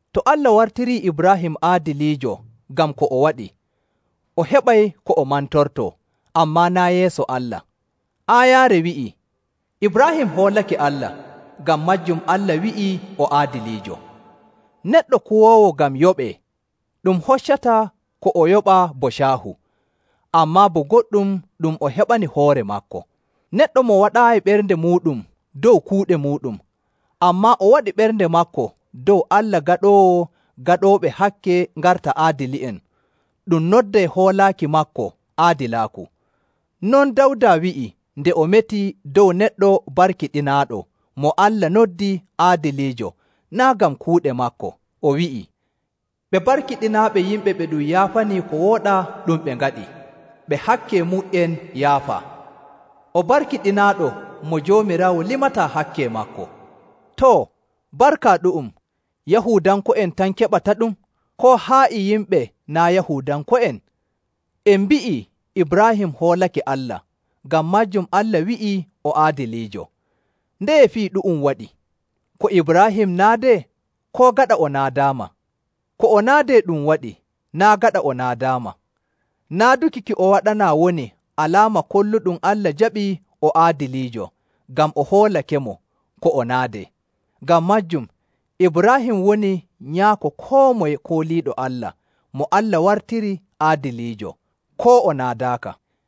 To Allah wartirii Ibraahim aadiliijo ngam ko o waɗi, o heɓay ko o mantortoo, ammaa naa' yeeso Allah. Aayaare wi'i, “Ibraahim hoolake Allah; ngam maajum Allah wi'i o aadiliijo.”. Neɗɗo kuwoowo ngam yoɓee, ɗum hoccataa ko o yoɓaa bo caahu, ammaa bo goɗɗum ɗum o heɓani hoore maako. Neɗɗo mo waɗaayi ɓernde muuɗum dow kuuɗe muuɗum, ammaa o waɗi ɓernde maako dow Allah gaɗoowo gaɗooɓe hakke ngarta aadili'en, ɗum nodday hoolaaki maako aadilaaku. Non Dawda wi'i nde o meti dow neɗɗo barkiɗinaaɗo mo Allah noddi aadiliijo naa' ngam kuuɗe maako. O wi'ii, “Ɓe barkiɗinaaɓe yimɓe ɓe ɗum yaafanii ko wooɗaa ɗum ɓe ngaɗi, ɓe hakke mu''en njaafaa. O barkiɗinaaɗo mo Joomiraawo limataa hakke maako.”. Too, barka ɗu'um, Yahuudanko'en tan keɓataɗum, koo haa e yimɓe naa' Yahuudanko'en? En mbi'ii, “Ibraahim hoolake Allah; ngam maajum Allah wi'i o aadiliijo.” Ndeye fii ɗu'um waɗi? Ko Ibraahim naadee, koo gaɗa o naadaama? Ko o naadee ɗum waɗi, naa' gaɗa o naadaama. Naaduki ki o waɗanaa woni alaama kolluɗum Allah jaɓii o aadiliijo ngam o hoolakemo ko o naadee. Ngam maajum, Ibraahim woni nyaako koo moye kooliiɗo Allah mo Allah wartiri aadiliijo, koo o naadaaka..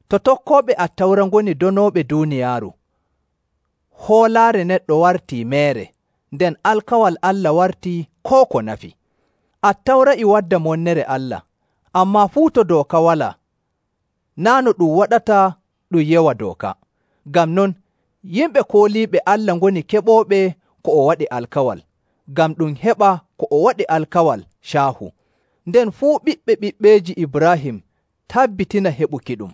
To tokkooɓe Attawra ngoni donooɓe duuniyaaru, hoolaare neɗɗo wartii meere, nden Alkawal Allah wartii koo ko nafi.. Attawra e wadda monnere Allah, ammaa fuu to dooka walaa, naa' no ɗum waɗata ɗum yewa dooka. Ngam non, yimɓe kooliiɓe Allah ngoni keɓooɓe ko o waɗi alkawal, ngam ɗum heɓa ko o waɗi alkawal caahu, nden fuu ɓiɓɓe ɓiɓɓeeji Ibraahim tabbitina heɓukiɗum,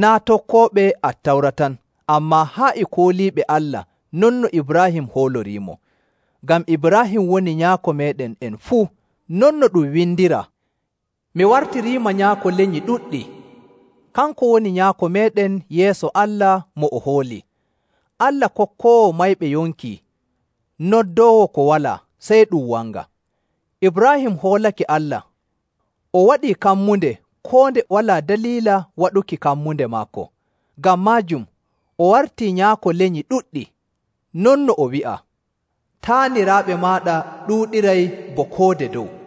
naa' tokkooɓe Attawra tan, ammaa haa e kooliiɓe Allah non no Ibraahim hooloriimo. Ngam Ibraahim woni nyaako meeɗen en fuu.. Non no ɗum windiraa, “Mi wartiriima nyaako lenyi ɗuɗɗi.” Kanko woni nyaako meeɗen yeeso Allah mo o hoolii, Allah kokkoowo mayɓe yonki, noddoowo ko walaa sey ɗum wanga.. Ibraahim hoolake Allah, o waɗii kammunde koo nde walaa daliila waɗuki kammunde maako. Ngam maajum, o wartii “Nyaako lenyi ɗuɗɗi,” non no o wi'aa, “Taaniraaɓe maaɗa ɗuuɗiray bo koode dow.”.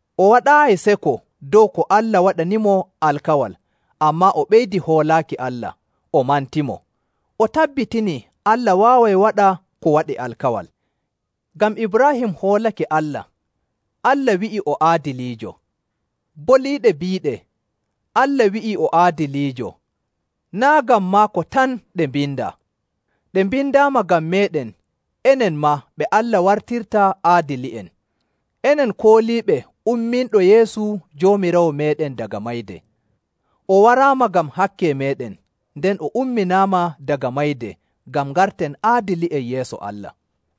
O waɗaayi seko dow ko Allah waɗanimo alkawal, ammaa o ɓeydii hoolaaki Allah, o mantiimo. O tabbitinii Allah waaway waɗa ko waɗi alkawal. Ngam Ibraahim hoolake Allah, “Allah wi'i o aadiliijo.” Boliiɗe biiɗe “Allah wi'i o aadiliijo,” naa' ngam maako tan ɗe mbindaa. Ɗe mbindaama ngam meeɗen enen maa ɓe Allah wartirta aadili'en, enen kooliiɓe umminɗo Yeesu Joomiraawo meeɗen daga mayde. O waraama ngam hakke meeɗen, nden o umminaama daga mayde ngam ngarten aadili'en yeeso Allah..